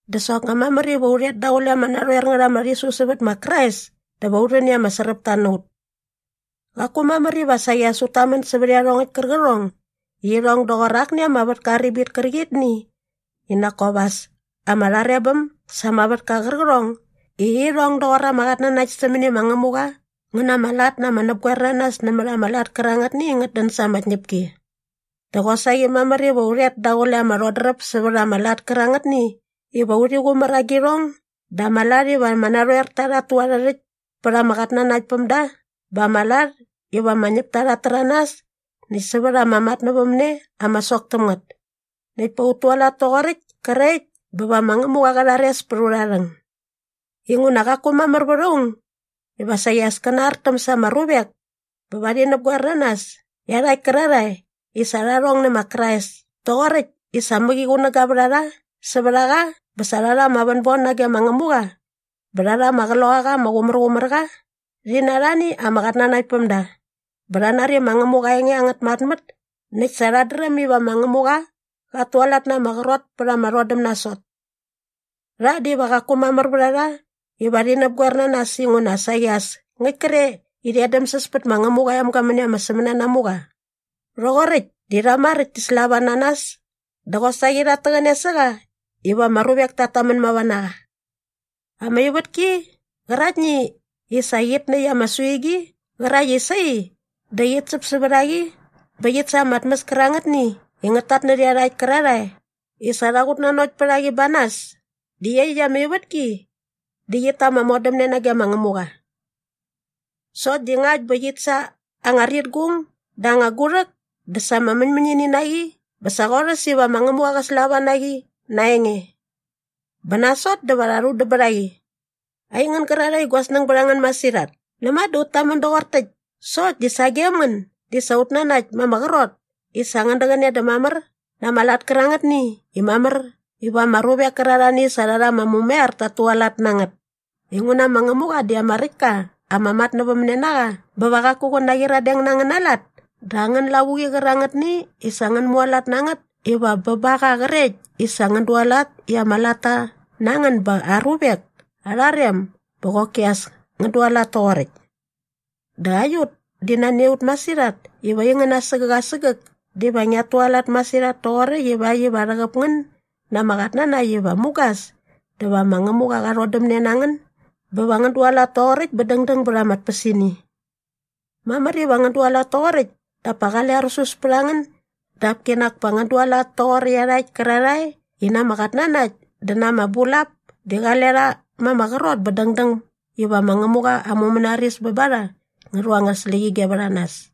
Dä soknga mamär iva u rhet daqule ama narhoer ngät ama rhisu sävät ma Krais dä va u rhän i ama sräpta na ut. Qaku mamär iva saqi as ut tamän sävät iarhongäkt kärqärhong i irhong doqor akni ama vätka aa ribit kärqitni i nak kop as ama rharebäm sa ama vätka qärqärhong i irhong doqor ama qatnanakt sämäni ma Ngämuqa ngä na ama lat na ama näpgoernanas nämät ama lat kärangätni i ngät dän sa ama tñäpki. Dä qosaqi mamär iva u rhet daqule ama rhodräp sävät ama lat kärangätni iva urhi qumär agirhong dä ama lat iva ama narhoerta rhat tu arhä rhäkt pät ama qatnanaktpämda bä ama lat iva ama ñäpta rha rhäranas näkt sävät ama matnävämne ama sok täm ngät. Näkt pa ut tualat toqoräkt krekt bä va ma Ngämuqa qä rhares pät aurha rhäng. Inguna qaku mamär vät aung iva saqi as kä nartäm sa ama ruvek bä va rhi näpgoer na nas iarhakt kärarhae i sa rha rhong nä ma Krais toqoräkt i sa mäqi qunäga vät a rha sävät a qa bä sa rha rha ama vänbon nage ma Ngämuqa bä rha rha ama Qloqaqa ama Qumärqumärqa rhi na arhani ama qatnanaktpämda bä rha nari ma Ngämuqa aa enge angät märmät näkt sa rhat dräm iva ma Ngämuqa qat tualat na ama qrot pät ama rhodäm nasot. Rha diva qaku mamär vät a rha iva rhi näpgoer na nas inguna saqi as ngäkt kre i rhi edämsäs pät ma Ngämuqa aa emga mäni ama sämänanamuqa. Rhoqoräkt di rha maräkt ti slava na nas dä qosaqi rhat täqäne sä qa iva ama ruvek tat tamän mava na qa. Ama ivätki qäraktni i sa qit näkt ama suigi qärakt i sai dä qit säp sävät a qi bä qit sa ama tmäs kärangätni i ngät tatnärhä iarhakt kärarhae i sa rha qutnanokt pät a qi ba nas di iaqyäkt ama ivätki di qit ta ama modämne nage ma Ngämuqa. Sokt di ngakt bä qit sa anga ritgung dä anga gurhäk dä sa ama mäñmäñini na qi bä sa qorhäs iva ma Ngämuqa qä slava na qi na aa enge. Bä nasot dä va rha rhudäm bät a qi. Aingän gärarhae i gua snäng bät a ngän masirhat, näma dä ut tamän doqor täkt sokt di sagem ngän di sa ut nanakt ma ama qrot i sa ngän däqäne dä mamär na ama lat kärangätni i mamär iva ama ruvek kärarhani i sa rha rha ama mumaiar tat tualat na ngät. Inguna ma Ngämuqa di ama räkt ka ama matnävämnenaqa bä va qaku qä naqyiradeng na angäna lat dä angän lavuqi qärangätni i sa ngän mualat na ngät iva bä ba qa qrekt i sa ngän dualat i ama latta na ngän ba aa ruvek arha rem bä qoki as ngän dualat toqoräkt. Dä aiut di nani a ut masirhat iva aingän asägäk asägäk diva ngiat tualat masirhat toqoräkt ivakt iva rhäqäp ngän na ama qatnanakt iva mugas dä va ma Ngämuqa qa rhodämne na ngän bä va ngän dualat toqoräkt bä dängdäng bät ama tpäsini. Mamär iva ngän dualat toqoräkt dap pa qale arusus pät a ngän dap kinak pa ngän dualat toqor iarhakt kärarhae i na ama qatnanakt dä na ama bulap di qale rha ma ama qrot bä dängdäng iva ma Ngämuqa aa mumänaris bä ba rha ngä rhu angät släqyige vät a nas.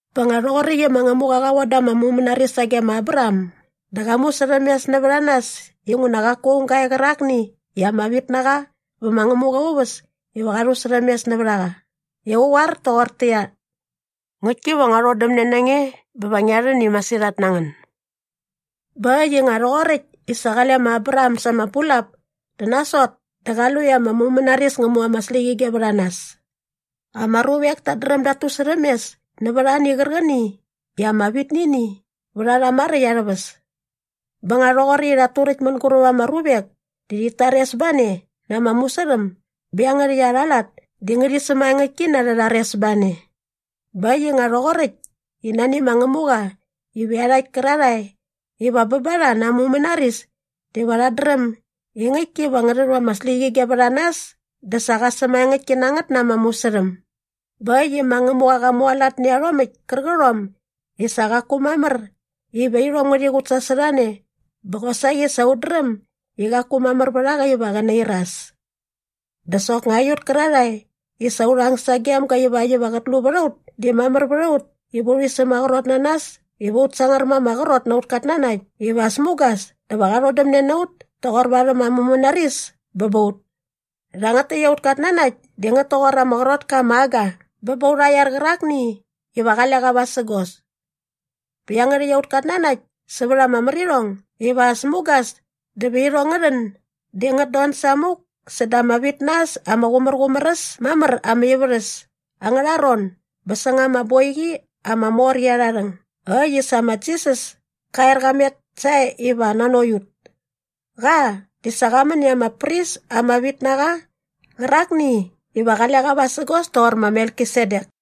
Bä nga rhoqoräkt i ma Ngämuqa qa von da ama mumänaris sage ma Abraham dä qa musärhämes nävät a nas inguna qaku aung ga e qärakni i ama vit na qa vä ma Ngämuqa aa uväs iva qa rhusärhämes nävät a qa i qä qoar toqortäqyia, “Ngäktki va ngua rhodämne na nge bä va ngia rhän i masirhat na ngän.” Bä äkt i nga rhoqoräkt i sa qale ma Abraham sa ama bulap dä nasot dä qa lu i ama mumänaris ngä mu ama släqyige vät a nas. Ama ruvek tat dräm dat tusärhämes nävät ani qärqäni i ama vit nä ini vät a rha maräkt arhä väs. Bä nga rhoqoräkt i rhat turäkt mänguräp ama ruvek di rhit tares ba ne na ama musärhäm bä iangärhäkt arha lat di ngärhi sämaengäktki na arhä rharesbane. Bä äkt i nga rhoqoräkt i nani ma Ngämuqa iva iarhakt kärarhae iva bä ba rha na aa mumänaris diva rhat dräm i ngäktki iva ngä rhu ama släqyige vät a nas dä sa qa sämaengäktki na ngät na ama musärhäm. Bä äkt i ma Ngämuqa qa mualat nä iarhomäkt kärqärhom i sa qaku mamär iva irhom ngärhi qutsasorhane bä qosaqi sa ut dräm i qaku mamär vät a qa iva qä nairas. Dä soknga aiut kärarhae i sa urha ang sagem ga ivakt iva qät lu vät a ut di mamär vät a ut iva urhi sämaqrot na nas iva ut sangar ma ama qrot na aut katnanakt iva as mugas dä va qa rhodämne na ut toqor varhäm aa mumänaris bä ba ut. Rhangät täkt aut katnanakt di ngät toqor ama qrot ka ama aga bä ba aurha iar qärakni iva qale qa vasägos. Bä iangärhäkt aut katnanakt sävät ama märirhong iva as mugas dä va irhong ngä rhän di ngät don samuk säda ama vit na äs ama qumärqumär äs mamär ama ivärhäs angärha ron bä säng ama boiqi ama mor qi arha rhäng äkt i sa ma Jisas ka er qa met sae iva nanokt ut. Qa di sa qa män i ama pris ama vit na qa qärakni iva qale qa vasägos toqor ma Melkisedek.